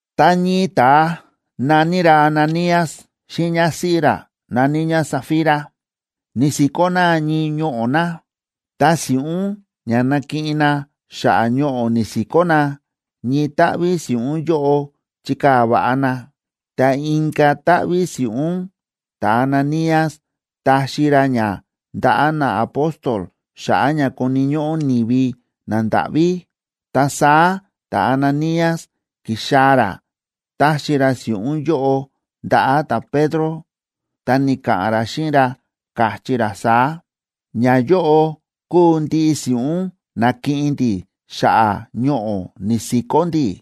Ta ñii ta̱a na̱ní ra Ananías xíꞌin ñásíꞌí ra na̱ní ñá Safira ni̱si̱kó na ñii ñoꞌo̱ na. Ta si̱ꞌún ña na̱kiꞌin na xa̱ꞌa̱ ñoꞌo̱ ni̱si̱kó na, ñii táꞌví si̱ꞌún yóꞌo chi̱kaa̱ va̱ꞌa na. Ta inka̱ táꞌví si̱ꞌún, ta̱Ananías ta̱xi ra ña ndaꞌa̱ naapóstol xa̱ꞌa̱ ña koni̱ ñóꞌó ni̱vi nandáꞌví. Ta saá ta̱Ananías ki̱xaa̱ ra taxi ra si̱ꞌún yóꞌo ndaꞌa̱ ta̱Pedro, ta ni̱ka̱ꞌa̱n ra xíꞌin ra, káchí ra saá: ―Ñayóꞌo kúu ndiꞌi si̱ꞌún na̱kiꞌin ndi̱ xa̱ꞌa̱ ñoꞌo̱ ni̱si̱kó ndi̱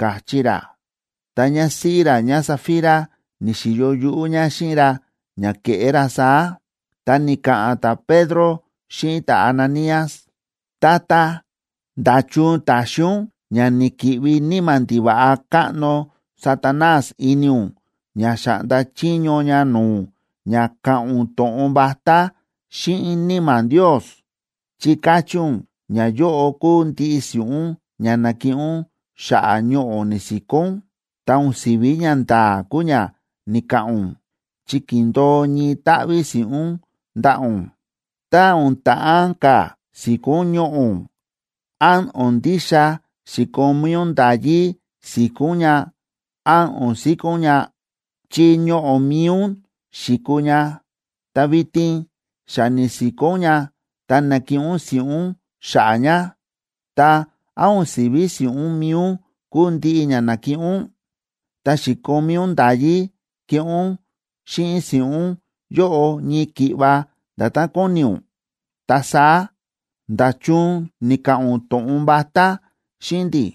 ―káchí ra. Ta ñásíꞌí ra ñáSafira ni̱xi̱yo yuꞌú ñá xíꞌin ra ña ke̱ꞌé ra saá. Ta ni̱ka̱ꞌa̱n ta̱Pedro xíꞌin ta̱Ananías: ―Tata, ¿nda̱chun ta̱xi ún ña ni̱ki̱ꞌvi níma̱ ndiva̱ꞌa káꞌno Satanás ini ún ña xáꞌnda chiño ña no̱o̱ ún ña ka̱ꞌa̱n ún to̱ꞌon vatá xíꞌin Níma̱ Ndios? Chi ka̱chí ún ñayóꞌo kúu ndiꞌi si̱ꞌún ña na̱kiꞌin ún xa̱ꞌa̱ ñoꞌo̱ ni̱si̱kó ún, ta o̱n si̱ví ñanda̱a̱ kúu ña ni̱ka̱ꞌa̱n ún, chi ki̱ndo̱o ñii táꞌví si̱ꞌún ndaꞌa̱ ún. Tá o̱n ta̱ꞌán ka̱ si̱kó ún ñoꞌo̱ ún, ¿án o̱n ndixa xi̱komí ún nda̱yí si̱kó ún ña án o̱n si̱kó ún ña?, chi ñoꞌo̱ mi̱i ún xi̱kuu ña. Ta vitin xa ni̱si̱kó ún ña ta na̱kiꞌin ún si̱ꞌún xa̱ꞌa̱ ña, ta, ¿án o̱n si̱ví si̱ꞌún mi̱i ún kúu ndiꞌi ña na̱kiꞌin ún? Ta xi̱komí ún nda̱yí keꞌé ún xíꞌin si̱ꞌún yóꞌo ñii ki̱ꞌva nda̱tán kóni ún. Ta saá, ¿nda̱chun ni̱ka̱ꞌa̱n ún to̱ꞌon vatá xíꞌin ndi̱?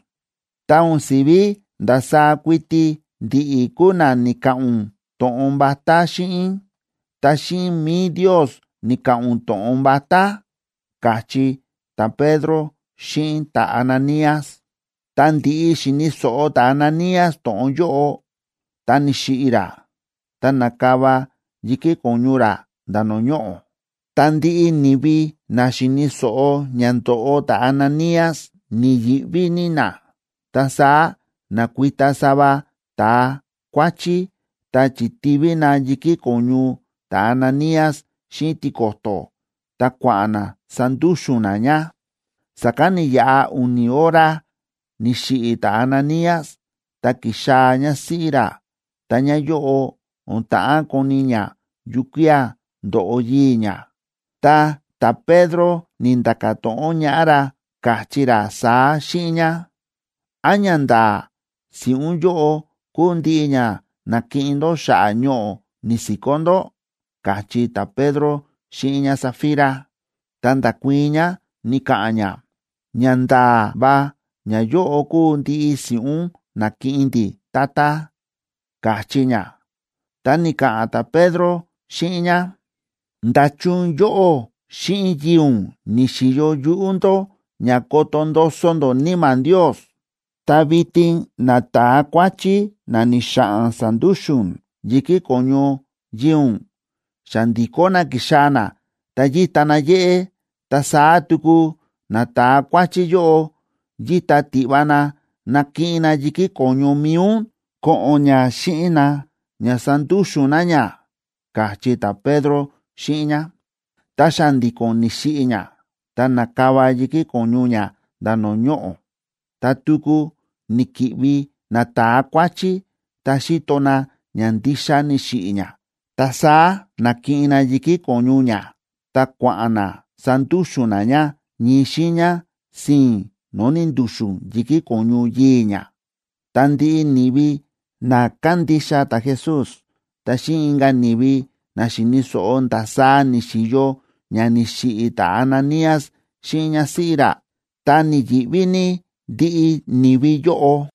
Ta o̱n si̱ví ndasaá kuiti ndi̱ꞌi̱ kúu na ni̱ka̱ꞌa̱n ún to̱ꞌon vatá xíꞌin, ta xíꞌin mi̱i Ndios ni̱ka̱ꞌa̱n ún to̱ꞌon vatá ―káchí ta̱Pedro xíꞌin ta̱Ananías. Tá ndi̱ꞌi xi̱ni̱ so̱ꞌo ta̱Ananías to̱ꞌon yóꞌo, ta ni̱xiꞌi̱ ra, ta na̱kava yi̱kí ko̱ñu ra nda̱ no̱o̱ ñoꞌo̱. Ta ndiꞌi ni̱vi na xi̱ni̱ so̱ꞌo ña ndo̱ꞌo ta̱Ananías ni̱yi̱ꞌví ní na. Ta saá na̱kuita sava ta̱a kuáchí, ta chi̱tíví na yi̱kí ko̱ñu ta̱Ananías xíꞌin tiko̱to̱, ta kua̱ꞌa̱n na sandúxu̱n na ña. Sa̱kán ni̱yaꞌa u̱ni̱ hora ni̱xiꞌi̱ ta̱Ananías, ta ki̱xaa̱ ñásíꞌí ra, ta ñáyóꞌo, o̱n ta̱ꞌán koni̱ ñá yukía̱ ndo̱ꞌo yii̱ ñá. Ta ta̱Pedro ni̱nda̱ka̱ to̱ꞌon ñaꞌá ra, káchí ra saá xíꞌin ñá: ―¿Án ñanda̱a̱ si̱ꞌún yóꞌo kúu ndiꞌi ña na̱kiꞌin ndó xa̱ꞌa̱ ñoꞌo̱ ni̱si̱kó ndó? ―káchí ta̱Pedro xíꞌin ñáSafira. Ta nda̱kuii̱n ñá, ni̱ka̱ꞌa̱n ñá: ―Ñanda̱a̱ va ñayóꞌo kúu ndiꞌi si̱ꞌún na̱kiꞌin ndi̱, tata ―káchí ñá. Ta ni̱ka̱ꞌa̱n ta̱Pedro xíꞌin ñá: ―¿Nda̱chun yóꞌó xíꞌin yii̱ ún ni̱xi̱yo yuꞌú ndó ña koto ndoso ndó Níma̱ Ndios? Ta vitin nata̱a kuáchí na ni̱xa̱ꞌa̱n sa̱ndúxu̱n yi̱kí ko̱ñu yii̱ ún xa ndi̱kó na ki̱xaa̱ na ta yíta na yéꞌé. Ta saá tuku nata̱a kuáchí yóꞌo yíta tiꞌva na nakiꞌin na yi̱kí ko̱ñu mi̱i ún ko̱ꞌo̱n ña xíꞌin na ña sandúxu̱n na ña ―káchí ta̱Pedro xíꞌin ñá. Ta xa̱ndi̱ko̱n ni̱xiꞌi̱ ñá, ta na̱kava yi̱kí ko̱ñu ñá nda̱ no̱o̱ ñoꞌo̱. Ta tuku ni̱ki̱ꞌvi nata̱a kuáchí, ta xi̱to na ña ndixa ni̱xiꞌi̱ ñá, ta saá na̱kiꞌin na yi̱kí ko̱ñu ñá, ta kua̱ꞌa̱n na sandúxu̱n na ña ñii xiiña sii̱n no̱o̱ ni̱ndu̱xu̱n yi̱kí ko̱ñu yii̱ ñá. Ta ndiꞌi ni̱vi na kándixa ta̱Jesús, ta xíꞌin inka̱ ni̱vi na xi̱ni̱ so̱ꞌo ndasaá ni̱xi̱yo ña ni̱xiꞌi̱ ta̱Ananías xíꞌin ñásíꞌí ra, ta ni̱yi̱ꞌví ní ndiꞌi ni̱vi yóꞌo.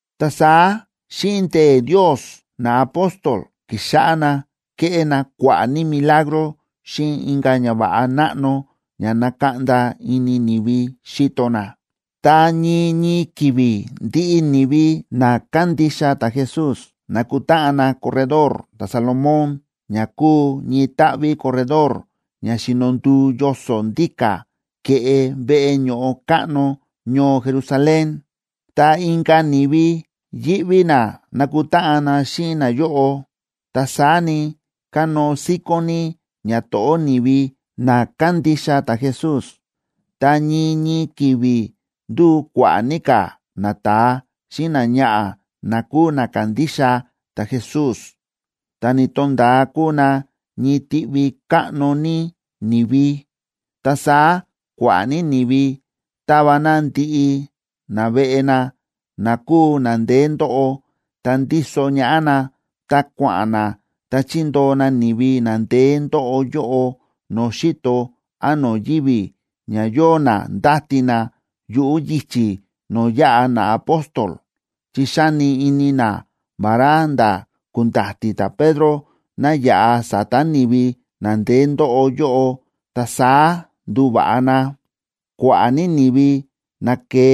Ta saá xíꞌin ndee̱ Ndios, naapóstol ki̱xáꞌá na kéꞌé na kua̱ꞌa̱ ní milagro xíꞌin inka̱ ñava̱ꞌa náꞌno ña nákaꞌnda ini ni̱vi xíto na. Ta ñii ñii ki̱vi̱ ndiꞌi ni̱vi na kándixa ta̱Jesús nákutáꞌan na Corredor ta̱Salomón ña kúu ñii táꞌví corredor ña xíno nduu yoso̱ ndíka̱ ke̱ꞌe veꞌe ño̱ꞌo káꞌno ñoo Jerusalén. Ta inka̱ ni̱vi yíꞌví na nakutáꞌan na xíꞌin nayóꞌo. Ta saá ni, kánóo síkón ní ñato̱ꞌó ni̱vi na kándixa ta̱Jesús. Ta ñii ñii ki̱vi̱ ndu̱u kua̱ꞌa̱ ní ka̱ nata̱a xíꞌin náñaꞌa̱ na kúu na ka̱ndixa ta̱Jesús, ta ni̱to̱nda̱a kúu na ñii tiꞌvi káꞌno ní ni̱vi. Ta saá kua̱ꞌa̱ ní ni̱vi ta̱va na ndiꞌi naveꞌe na na kúu na ndeé ndóꞌo, ta ndíso ñaꞌá na, ta kua̱ꞌa̱n na, ta chi̱ndoo na ni̱vi na ndeé ndóꞌo yóꞌo no̱o̱ xi̱to án no̱o̱ yivi̱, ña yóo na ndáti na yuꞌu̱ yichi̱ no̱o̱ yaꞌa naapóstol. Chi xáni ini na vará nda̱ ku̱nda̱ti̱ ta̱Pedro ná yaꞌa sa̱ta̱ ni̱vi na ndeé ndóꞌo yóꞌo, ta saá nduva̱ꞌa na. Kua̱ꞌa̱ ní ni̱vi na ke̱e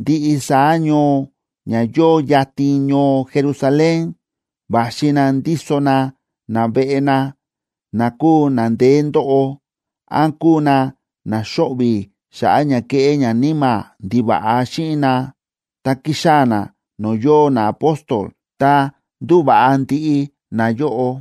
ndiꞌi saá ñoo ña yóo yatin ñoo Jerusalén, va̱xi na ndíso na naveꞌe na, na kúu na ndeé ndóꞌo, án kúu na na xóꞌvi̱ xa̱ꞌa̱ ña kéꞌé ñaníma̱ ndiva̱ꞌa xíꞌin na, ta ki̱xaa̱ na no̱o̱ yóo naapóstol, ta ndu̱va̱ꞌa ndiꞌi nayóꞌo.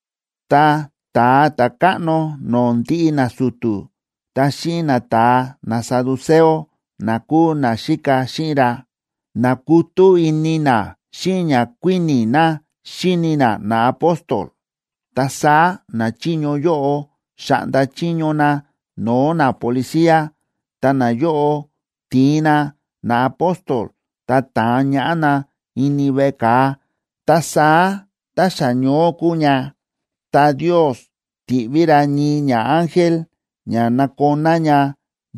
Ta ta̱a ta̱káꞌno no̱o̱ ndiꞌi nasu̱tu̱, ta xíꞌin nata̱a nasaduceo,a na kúu na xíka xíꞌin ra, na̱kutú ini na xíꞌin ña kuíni̱ na xíni na naapóstol. Ta saá nachiño yóꞌo xa̱ꞌnda chiño na no̱o̱ napolicía, ta nayóꞌo ti̱in na naapóstol ta ta̱an ñaꞌá na ini veꞌe ka̱a. Ta saá tá xa ñoó kúu ña, ta Ndios ti̱ꞌví ra ñii ñaángel ña nakoná ña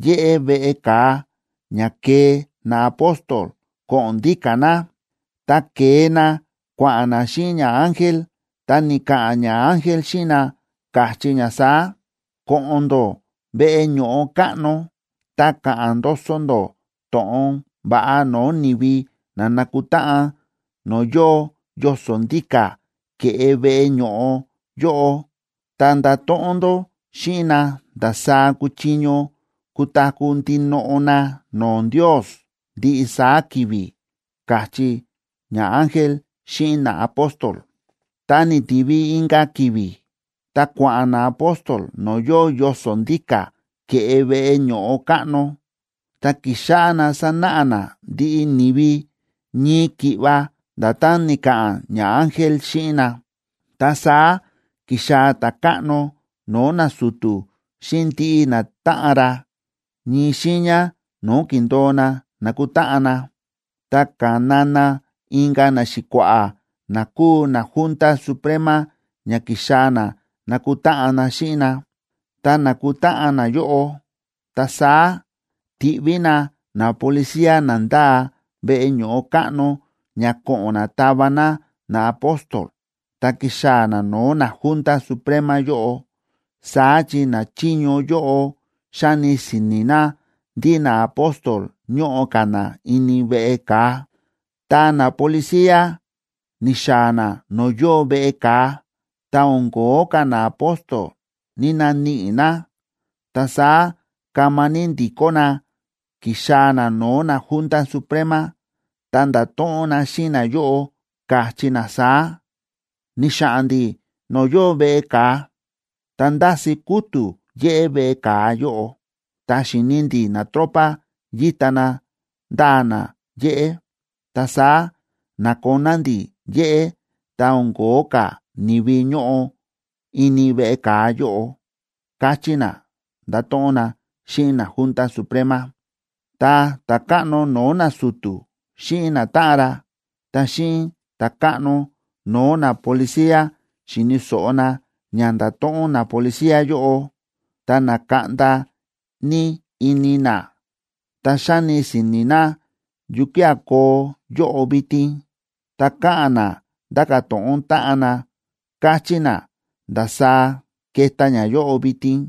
yéꞌé veꞌe ka̱a, ña kee naapóstol ko̱ꞌo̱n ndíka̱ na. Ta ke̱e na kua̱ꞌa̱n na xíꞌin ñaángel, ta ni̱ka̱ꞌa̱n ñaángel xíꞌin na, káchí ña saá: ―Ko̱ꞌo̱n ndó veꞌe ño̱ꞌo káꞌno, ta ka̱ꞌa̱n ndoso ndó to̱ꞌon va̱ꞌa no̱o̱ ni̱vi na na̱kutáꞌan no̱o̱ yóo yoso̱ ndíka̱ ke̱ꞌe veꞌe ño̱ꞌo yóꞌo, ta ndato̱ꞌon ndó xíꞌin na ndasaá kuchiño kutaku̱ ndinoꞌo na no̱o̱ Ndios ndiꞌi saá ki̱vi̱ ―káchí ñaángel xíꞌin naapóstol. Tá ni̱tivi inka̱ ki̱vi̱, ta kua̱ꞌa̱n naapóstol no̱o̱ yóo yoso̱ ndíka̱ ke̱ꞌe veꞌe ño̱ꞌo káꞌno, ta ki̱xáꞌá na sánáꞌa na ndiꞌi ni̱vi, ñii ki̱ꞌva nda̱tán ni̱ka̱ꞌa̱n ñaángel xíꞌin na. Ta saá ki̱xaa̱ ta̱káꞌno no̱o̱ nasu̱tu̱ xíꞌin ndiꞌi natáꞌan ra, ñii xiiña no̱o̱ ki̱ndo̱o na nakutáꞌan na. Ta ka̱na na inka̱ naxi̱kua̱ꞌa̱ na kúu naJunta Suprema ña kixaa̱ na nakutáꞌan na xíꞌin na. Tá na̱kutáꞌan nayóꞌo, ta saá ti̱ꞌví na napolicía na ndáa veꞌe ño̱ꞌo káꞌno ña ko̱ꞌo̱n na tava na naapóstol ta kixaa̱ na no̱o̱ naJunta Suprema yóꞌo. Saá chi nachiño yóꞌo xáni si̱ni̱ na ndí naapóstol ñóꞌo ka̱ na ini veꞌe ka̱a. Tá napolicía ni̱xaa̱ na no̱o̱ yóo veꞌe ka̱a, ta o̱n ko̱ó ka̱ naapóstol ni̱‑naníꞌi na. Ta saá kama ní ndi̱kó na ki̱xaa̱ na no̱o̱ naJunta Suprema, ta nda̱to̱ꞌon na xíꞌin nayóꞌo, káchí na saá: ―Ni̱xa̱ꞌa̱n ndi̱ no̱o̱ yóo veꞌe ka̱a, ta ndási kútu̱ yéꞌé veꞌe ka̱a yóꞌo, ta xi̱ni ndi̱ natropa yíta na ndáa na yéꞌé. Ta saá na̱koná ndi̱ yéꞌé, ta o̱n ko̱ó ka̱ ni̱vi ñóꞌo ini veꞌe ka̱a yóꞌo ―káchí na, nda̱to̱ꞌon na xíꞌin naJunta Suprema. Tá ta̱káꞌno no̱o̱ nasu̱tu̱ xíꞌin natáꞌan ra, ta xíꞌin ta̱káꞌno no̱o̱ napolicía xi̱ni̱ so̱ꞌo na ña nda̱to̱ꞌon napolicía yóꞌo, ta na̱kaꞌnda ní ini na. Ta xáni si̱ni̱ na yukía̱ koo yóꞌo vitin, ta káꞌa̱n na ndáka̱ to̱ꞌon táꞌan na, káchí na ndasaá keta ñayóꞌo vitin.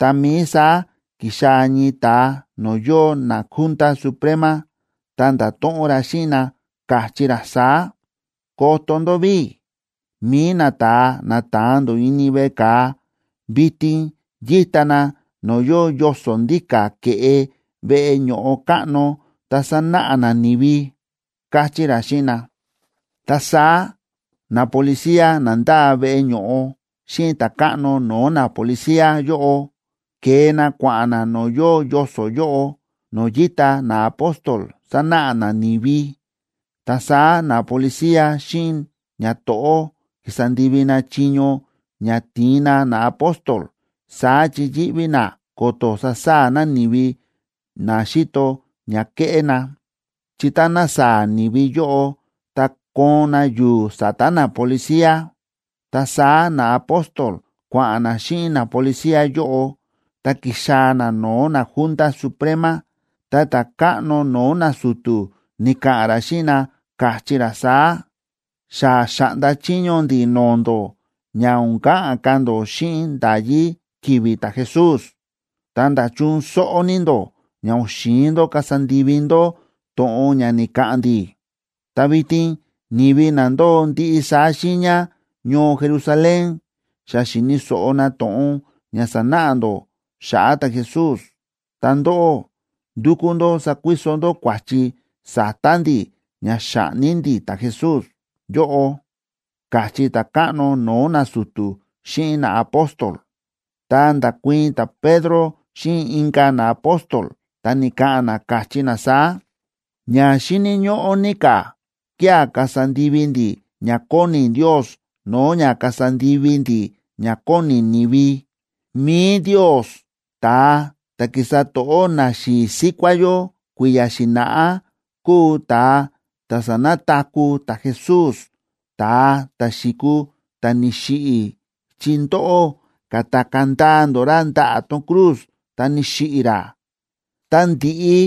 Tá mií saá ki̱xaa̱ ñii ta̱a no̱o̱ yóo naJunta Suprema, ta nda̱to̱ꞌon ra xíꞌin na, káchí ra saá: ―Koto ndó ví, mi̱i nata̱a na ta̱an ndó ini veꞌe ka̱a, vitin yíta na no̱o̱ yóo yoso̱ ndíka̱ ke̱ꞌe veꞌe ño̱ꞌo káꞌno, ta sánáꞌa na ni̱vi ―káchí ra xíꞌin na. Ta saá napolicía na ndáa veꞌe ño̱ꞌo xíꞌin ta̱káꞌno no̱o̱ napolicía yóꞌo, ke̱e na kua̱ꞌa̱n na no̱o̱ yóo yoso̱ yóꞌo, no̱o̱ yíta naapóstol sánáꞌa na ni̱vi. Ta saá napolicía xíꞌin ñato̱ꞌó ki̱sa ndivi na chiño ña ti̱in na naapóstol, saá chi yíꞌví na ko̱to̱ sasaa̱ na ni̱vi na xíto ña kéꞌé na, chi táná saa̱ ni̱vi yóꞌo, ta koon na yu̱u̱ sa̱ta̱ napolicía. Ta saá naapóstol kua̱ꞌa̱n na xíꞌin napolicía yóꞌo, ta ki̱xaa̱ na no̱o̱ naJunta Suprema. Ta ta̱káꞌno no̱o̱ nasu̱tu̱ ni̱ka̱ꞌa̱n ra xíꞌin na, káchí ra saá: ―Xa xa̱ꞌnda chiño ndi̱ no̱o̱ ndó ña o̱n ka̱ꞌa̱n ka̱ ndó xíꞌin nda̱yí ki̱vi̱ ta̱Jesús. Ta, ¿nda̱chun sóꞌó ní ndó ña o̱n xi̱in ndó kasa ndivi ndó to̱ꞌon ña ni̱ka̱ꞌa̱n ndi̱? Ta vitin ni̱vi na ndóo ndiꞌi saá xiiña ñoo Jerusalén xa xi̱ni̱ so̱ꞌo na to̱ꞌon ña sánáꞌa ndó xa̱ꞌa̱ ta̱Jesús. Ta ndóꞌó ndúkú ndó sakuiso ndó kua̱chi sa̱ta̱ ndi̱ ña xa̱ꞌni ndi̱ ta̱Jesús yóꞌo ―káchí ta̱káꞌno no̱o̱ nasu̱tu̱ xíꞌin naapóstol. Ta nda̱kuii̱n ta̱Pedro xíꞌin inka̱ naapóstol, ta ni̱ka̱ꞌa̱n na, káchí na saá: ―Ña xíni̱ ñóꞌó ní ka̱ kía̱ kasa ndivi ndi̱ ña kóni Ndios no̱o̱ ña kasa ndivi ndi̱ ña kóni ni̱vi. Mi̱i Ndios, ta̱a ta̱ ki̱sa to̱ꞌó naxi̱i̱ síkuá yó kui̱ya̱ xi̱na̱ꞌá, kúu ta̱a ta̱ sa̱nataku̱ ta̱Jesús, ta̱a ta̱ xi̱kuu ta̱ ni̱xiꞌi̱ chi ndóꞌó ka̱takaa̱ ndaa ndó ra ndaꞌa̱ tón cruz, ta ni̱xiꞌi̱ ra. Tá ndi̱ꞌi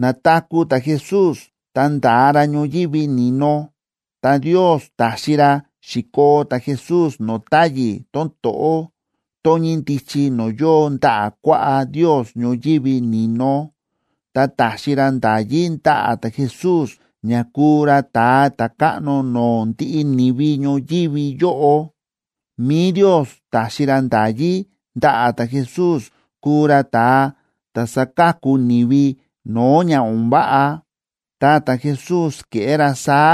na̱taku̱ ta̱Jesús ta nda̱a ra ñoyívi ni̱no, ta Ndios ta̱xi ra xi̱koo ta̱Jesús no̱o̱ táyi̱ tón to̱ꞌó, tón ñíndichi no̱o̱ yóo ndaꞌa̱ kuaꞌá Ndios ñoyívi ni̱no, ta ta̱xi ra nda̱yí ndaꞌa̱ ta̱Jesús ña kúu ra Ta̱a Ta̱káꞌno no̱o̱ ndiꞌi ni̱vi ñoyívi yóꞌo. Mi̱i Ndios ta̱xi ra nda̱yí ndaꞌa̱ ta̱Jesús kúu ra Ta̱a ta̱ sáka̱ku ni̱vi no̱o̱ ña o̱n váꞌa. Ta ta̱Jesús ke̱ꞌé ra saá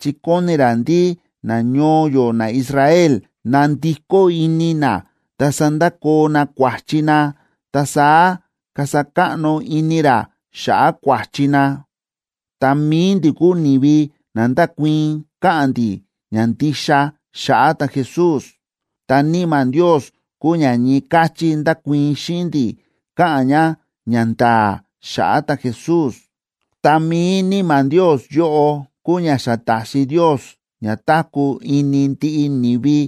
chi kóni ra ndí nañoo yó naIsrael nandikó ini na ta sandakoo na kua̱chi na, ta saá kasa káꞌno ini ra xa̱ꞌa̱ kua̱chi na. Ta mi̱i ndi̱ kúu ni̱vi na ndákuii̱n káꞌa̱n ndi̱ ñandixa xa̱ꞌa̱ ta̱Jesús. Ta Níma̱ Ndios kúu ña ñii káchí ndákuii̱n xíꞌin ndi̱ káꞌa̱n ña ñanda̱a̱ xa̱ꞌa̱ ta̱Jesús. Ta mi̱i Níma̱ Ndios yóꞌo kúu ña xa ta̱xi Ndios ña táku̱ ini ndiꞌi ni̱vi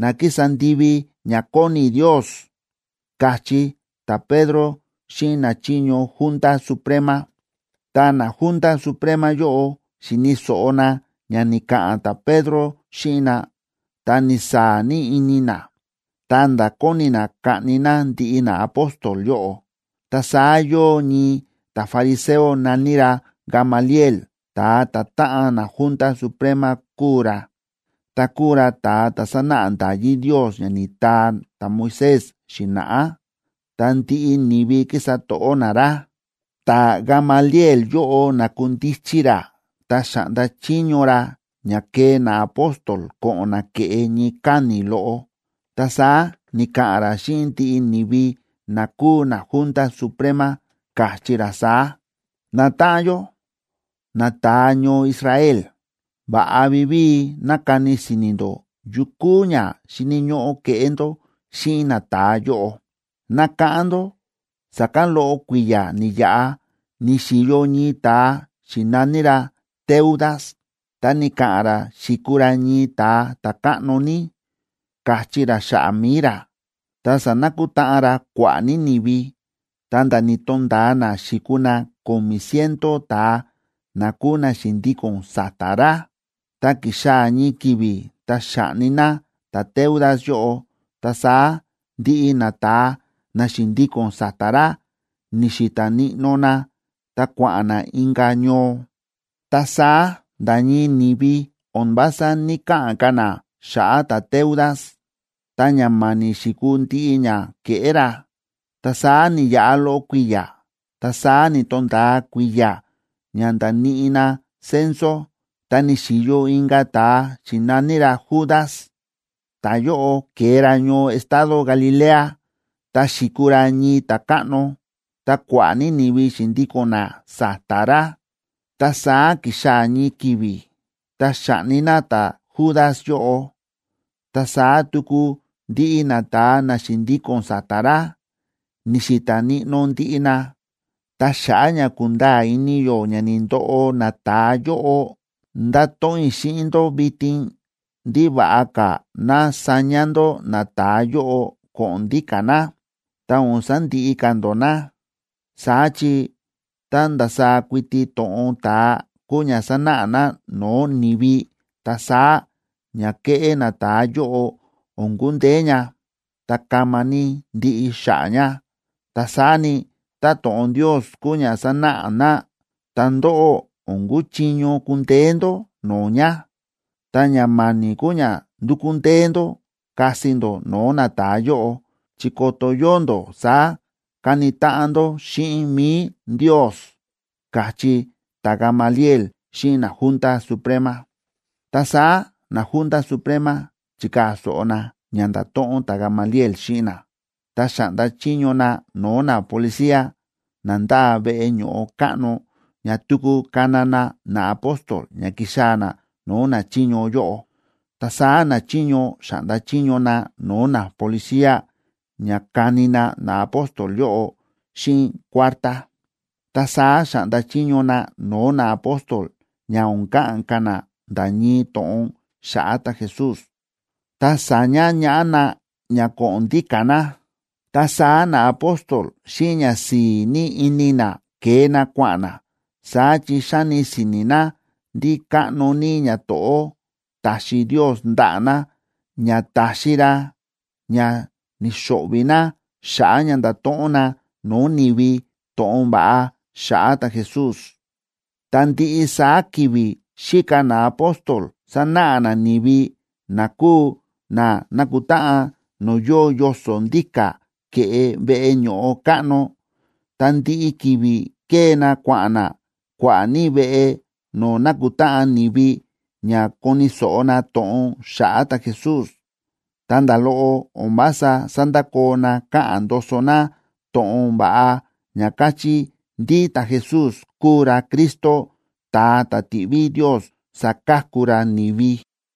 na kísa ndivi ña kóni Ndios ―káchí ta̱Pedro xíꞌin nachiño Junta Suprema. Tá naJunta Suprema yóꞌo xi̱ni̱ so̱ꞌo na ña ni̱ka̱ꞌa̱n ta̱Pedro xíꞌin na, ta ni̱saa̱ ní ini na, ta̱nda̱ kóni na kaꞌni na ndiꞌi naapóstol yóꞌo. Ta saá yóo ñii ta̱fariseo na̱ní ra Gamaliel, ta̱a ta̱táꞌan naJunta Suprema kúu ra, ta kúu ra ta̱a ta̱ sánáꞌa nda̱yí Ndios ña ni̱taa ta̱Moisés xi̱na̱ꞌá, ta ndiꞌi ni̱vi kísa to̱ꞌó na ra. Ta̱Gamaliel yóꞌo na̱kundichi ra, ta xa̱ꞌnda chiño ra ña kee naapóstol ko̱ꞌo̱n na ke̱ꞌe ñii káni̱ loꞌo, ta saá ni̱ka̱ꞌa̱n ra xíꞌin ndiꞌi ni̱vi na kúu naJunta Suprema, káchí ra saá: ―Natáꞌan yó, nata̱a ñoo Israel, va̱ꞌa vivíi ná kani si̱ni̱ ndó yu kúu ña xíni̱ ñóꞌó keꞌé ndó xíꞌin nata̱a yóꞌo. Nákáꞌán ndó sa̱kán loꞌo kui̱ya̱ ni̱yaꞌa ni̱xi̱yo ñii ta̱a xi̱na̱ní ra Teudas, ta ni̱ka̱ꞌa̱n ra xi̱kuu ra ñii ta̱a ta̱káꞌno ní, káchí ra xa̱ꞌa̱ mi̱i ra. Ta sa̱nakutáꞌan ra kua̱ꞌa̱ ní ni̱vi, ta̱nda̱ ni̱to̱nda̱a na xi̱kuu na ko̱mi̱ ciento ta̱a na kúu na xi̱ndíko̱n sa̱ta̱ ra. Ta ki̱xaa̱ ñii ki̱vi̱, ta xa̱ꞌni na ta̱Teudas yóꞌo, ta saá ndiꞌi nata̱a na xi̱ndíko̱n sa̱ta̱ ra ni̱xi̱ta̱ níꞌnó na ta kua̱ꞌa̱n na inka̱ ñoo. Ta saá nda̱ ñii ni̱vi o̱n vása ní‑kaꞌa̱n ka̱ na xa̱ꞌa̱ ta̱Teudas, ta ña ma̱ni̱ xi̱kuu ndiꞌi ña ke̱ꞌé ra. Ta saá ni̱yaꞌa loꞌo kui̱ya̱, ta saá ni̱to̱nda̱a kui̱ya̱ ña nda̱níꞌi na censo, ta ni̱xi̱yo inka̱ ta̱a xi̱na̱ní ra Judas. Ta̱yóꞌo ke̱e ra ñoo estado Galilea, ta xi̱kuu ra ñii ta̱káꞌno, ta kua̱ꞌa̱ ní ni̱vi xi̱ndíko̱n na sa̱ta̱ ra. Ta saá ki̱xaa̱ ñii ki̱vi̱, ta xa̱ꞌni na ta̱Judas yóꞌo, ta saá tuku ndiꞌi nata̱a na xi̱ndíko̱n sa̱ta̱ ra, ni̱xi̱ta̱ níꞌnó ndiꞌi na. Ta xa̱ꞌa̱ ña kúnda̱a̱ ini yó ña ni̱ndoꞌo nata̱a yóꞌo, ndáto̱ꞌon i̱ xíꞌin ndó vitin ndí va̱ꞌa ka̱ ná saña ndó nata̱a yóꞌo ko̱ꞌo̱n ndíka̱ na, ta o̱n sandiꞌi ka̱ ndó na. Saá chi, tá ndasaá kuiti to̱ꞌon ta̱a kúu ña sánáꞌa na no̱o̱ ni̱vi, ta saá ña kéꞌé nata̱a yóꞌo o̱n kundeé ña, ta kama ní ndiꞌi xa̱ꞌa̱ ña. Ta saá ni, tá to̱ꞌon Ndios kúu ña sánáꞌa na, ta ndóꞌó o̱n kuchiño kundeé ndó no̱o̱ ña, ta ña ma̱ni̱ kúu ña ndukú ndee ndó kasi ndó no̱o̱ nata̱a yóꞌo, chi ko̱to̱ yóo ndó saá káni táꞌan ndó xíꞌin mi̱i Ndios ―káchí ta̱Gamaliel xíꞌin naJunta Suprema. Ta saá naJunta Suprema chi̱kaa̱ so̱ꞌo na ña nda̱to̱ꞌon ta̱Gamaliel xíꞌin na. Ta xa̱ꞌnda chiño na no̱o̱ napolicía na ndáa veꞌe ño̱ꞌo káꞌno ña tuku kana na naapóstol ña kixaa̱ na no̱o̱ nachiño yóꞌo. Ta saá nachiño xa̱ꞌnda chiño na no̱o̱ napolicía ña kani na naapóstol yóꞌo xíꞌin kuártá. Ta saá xa̱ꞌnda chiño na no̱o̱ naapóstol ña o̱n ka̱ꞌa̱n ka̱ na nda̱ ñii to̱ꞌon xa̱ꞌa̱ ta̱Jesús, ta sa̱ña ñaꞌá na ña ko̱ꞌo̱n ndíka̱ na. Ta saá naapóstol, xíꞌin ñasi̱i̱ ní ini na, ke̱e na kua̱ꞌa̱n na. Saá chi xáni si̱ni̱ na ndí káꞌno ní ñato̱ꞌó ta̱xi Ndios ndaꞌa̱ na, ña ta̱xi ra ña ni̱xo̱ꞌvi̱ na xa̱ꞌa̱ ña nda̱to̱ꞌon na no̱o̱ ni̱vi to̱ꞌon va̱ꞌa xa̱ꞌa̱ ta̱Jesús. Ta ndiꞌi saá ki̱vi̱ xíka naapóstol sánáꞌa na ni̱vi na kúu na na̱kutáꞌan no̱o̱ yóo yoso̱ ndíka̱ ke̱ꞌe veꞌe ño̱ꞌo káꞌno. Ta ndiꞌi ki̱vi̱ kée na kua̱ꞌa̱n na kua̱ꞌa̱ ní veꞌe no̱o̱ na̱kutáꞌan ni̱vi ña koni̱ so̱ꞌo na to̱ꞌon xa̱ꞌa̱ ta̱Jesús. Ta nda̱ loꞌo o̱n vása sándakoo na káꞌa̱n ndoso na to̱ꞌon va̱ꞌa ña káchí ndí ta̱Jesús kúu ra Cristo, ta̱a ta̱ ti̱ꞌví Ndios saka̱ku ra ni̱vi.